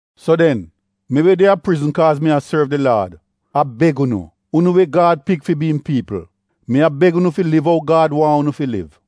So den, mi we de a prizn, kaaz mi a sorv di Laad a beg unu — unu we Gad pik fi bi im piipl. Mi a beg unu fi liv ou Gad waahn unu fi liv.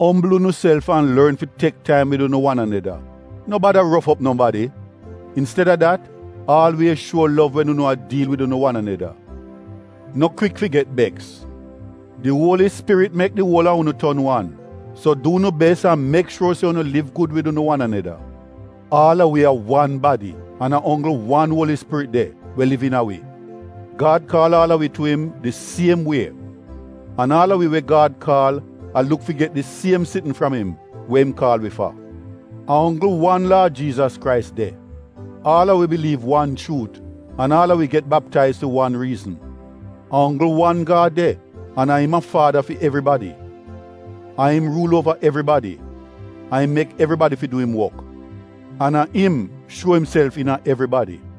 Ombl unuself an lorn fi tek taim wid unu wan aneda. No bada rof op nobadi. Insteda dat, aalwiez shuo lov, wen unu a diil wid unu wan aneda. No kwik fi get beks. Di Uoli Spirit mek di uol a unu ton wan. So du unu bes an mek shuor se unu liv gud wid unu wan aneda. Aal a wi a wan badi an a onggl wan Uoli Spirit de, we liv iina wi. Gad kaal aal a wi tu im di siem wie. An aal a wi we Gad kaal a luk fi get di siem sitn fram im we im kaal wi fa. A onggl wan Laad Jiizas Krais de. Aal a wi biliiv wan chuut an aal a wi get baptaiz fi wan riizn. A onggl wan Gad de an a im a Faada fi evribadi, a im ruul uova evribadi, a im mek evribadi fi du im wok, an a im shuo imself iina evribadi.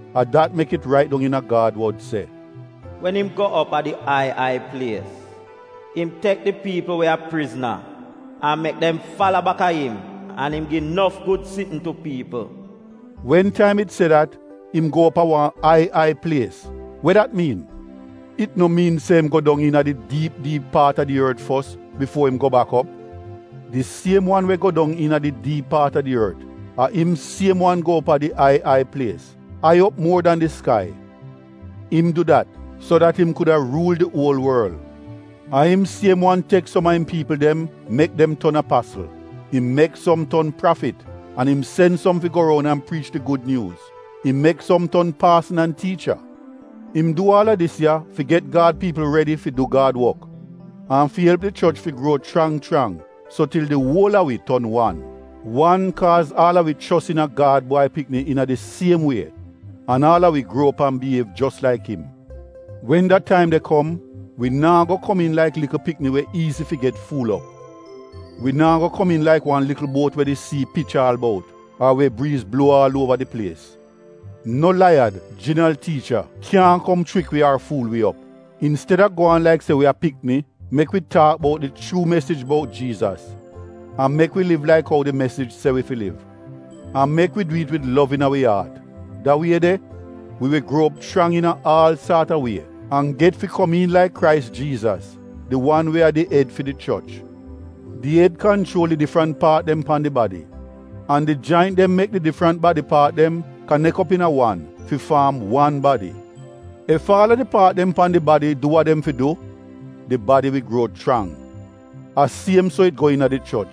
A dat mek it rait dong iina Gad wod se: “Wen im go op a di ai ai plies, im tek di piipl we a prizn an mek dem fala bak a im an im gi nof gud sitn tu piipl.” (Wen taim it se dat “Im go op a wan ai ai plies,” we dat miin? It no miin se im go dong iina di diip diip paat a di ort fos bifuo im go bak op? Di siem wan we go dong iina di diip paat a di ort, a im siem wan go op a di ai ai plies, ai op muor dan di skai. Im du dat, so dat im kuda ruul di uol worl.) A im siem wan tek som a im piipl dem mek dem ton apasl. Im mek som ton prafit an im sen som fi go roun an priich di gud nyuuz. Im mek som ton paasn an tiicha. Im du aal a dis ya fi get Gad piipl redi fi du Gad wok an fi elp di choch fi gruo chrang chrang, so til di uol a wi ton wan; wan, kaaz aal a wi chos iina Gad Bwai Pikni iina di siem wie, an aal a wi gruo op an biyiev jos laik im. Wen da taim de kom, wi naa go komiin laik likl pikni we iizi fi get fuul op. Wi naa go komiin laik wan likl buot we di sii pich aal bout, ar we briiz bluo aal uova di plies. No laiyad, jinal tiicha kyaahn kom chrik wi ar fuul wi op. Insteda gwaan laik se wi a pikni, mek wi taak bout di chuu mesij bout Jiizas an mek wi liv laik ou di mesij se wi fi liv. An mek wi du it wid lov iina wi aat. Da wie de, wi wi gruo op chrang iina aal saat a wie an get fi komiin laik Krais Jiizas, di wan we a di ed fi di choch. Di ed kanchuol di difrant paat dem pan di badi. An di jaint dem mek di difrant badi paat dem kanek op iina wan fi faam wan badi. Ef aal a di paat dem pan di badi du wa dem fi du, di badi wi gruo chrang. A siem so it go iina di choch.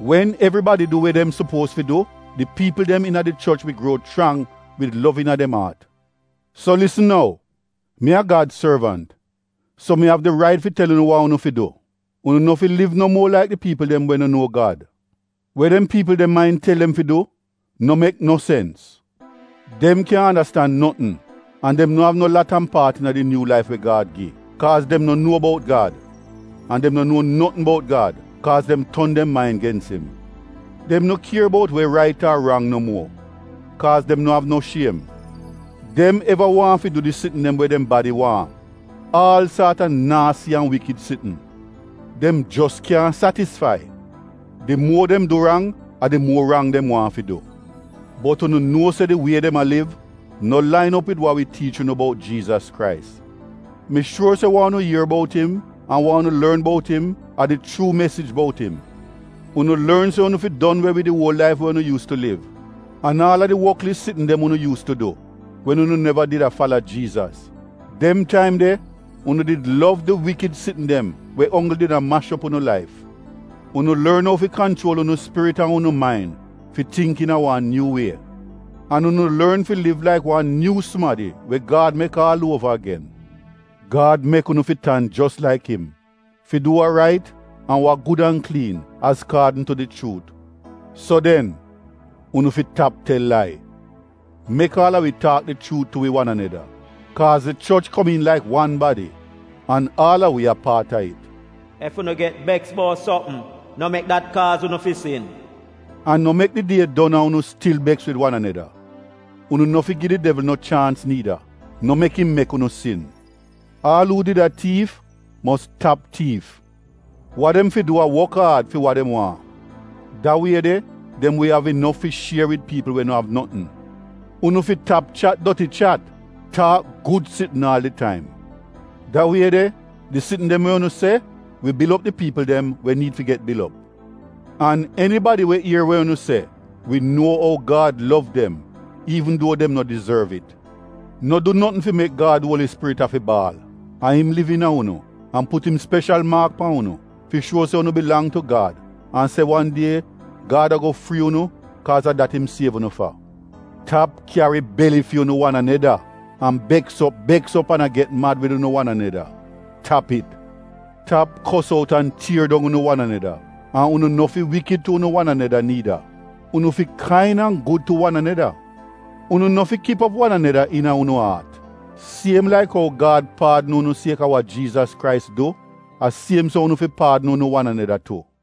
Wen evribadi du we dem supuoz fi du, di piipl dem iina di choch wi gruo chrang wid lov iina dem aat. So, lisn nou! Mi a Gad sorvant so mi av di rait fi tel unu wa unu fi du. Unu no fi liv no muo laik di piipl dem we no nuo Gad. We dem piipl de main tel dem fi du no mek no sens. Dem kyaahn andastan notn, an dem no av no lat an paat iina di nyuu laif we Gad gi, kaaz dem no nuo bout Gad. An dem no nou notn bout Gad, kaaz dem ton dem main gens im. Dem no kier bout we rait ar rang no muo, kaaz dem no av no shiem. Dem eva waahn fi du di sitn dem we dem badi waahn — aal saat a naasi an wikid sitn. Dem jos kyaahn satisfai. Di muo dem du rang, a di muo rang dem waahn fi du. Bot unu nuo se di wie dem a liv no lain op wid wa wi tiich unu bout Jiizas Krais. Mi shuor se wa unu ier bout im, an wa unu lorn bout im, a di chuu mesij bout im. Unu lorn se unu fi don we wid di uol laif we unu yuus tu liv an aal a di wotlis sitn dem unu yuus tu du, wen unu neva did a fala Jiizas. Dem taim de, unu did lov di wikid sitn dem we onggl did a mash op unu laif. Unu lorn ou fi kanchuol unu spirit an unu main fi tingk iina wan nyuu wie. An unu lorn fi liv laik wan nyuu sumadi we Gad mek aal uova agen. Gad mek unu fi tan jos laik im — fi du wa rait an wa gud an kliin azkaadn tu di chuut. So den, unu fi tap tel lai. Mek aal a wi taak di chuut tu wi wan aneda, kaaz di choch komiin laik wan badi, an aal a wi a paat a it. Ef unu get beks bout sopm, no mek dat kaaz unu fi sin. An no mek di die don an unu stil beks wid wan aneda. Unu no fi gi di devl no chaans niida. No mek im mek unu sin. Aal uu did a tiif mos tap tiif. Wa dem fi du a wok aad fi wa dem waahn. Da wie de, dem wi av inof fi shier wid piipl we no av notn. Unu fi tap chat doti chat. Taak gud sitn aal di taim. Da wie de, di sitn dem we unu se wi bil op di piipl dem we niid fi get bil op. An enibadi we ier we unu se wi nuo ou Gad lov dem iivn duo dem no dizorv it. No du notn fi mek Gad Uoli Spirit afi baal. A im liv iina unu an put im speshal maak pan unu fi shuo se unu bilang tu Gad an se wan die Gad ago frii unu kaaz a dat im siev unu fa. Tap kyari beli fi unu wan aneda, an beks op beks op an a get mad wid unu wan aneda — tap it. Tap kos out an tier dong unu wan aneda an unu no fi wikid tu unu wan aneda niida. Unu fi kain an gud tu wan aneda. Unu no fi kip op wan aneda iina unu aat. Siem laik ou Gad paadn unu sieka wa Jiizas Krais du, a siem so unu fi paadn unu wan aneda tu.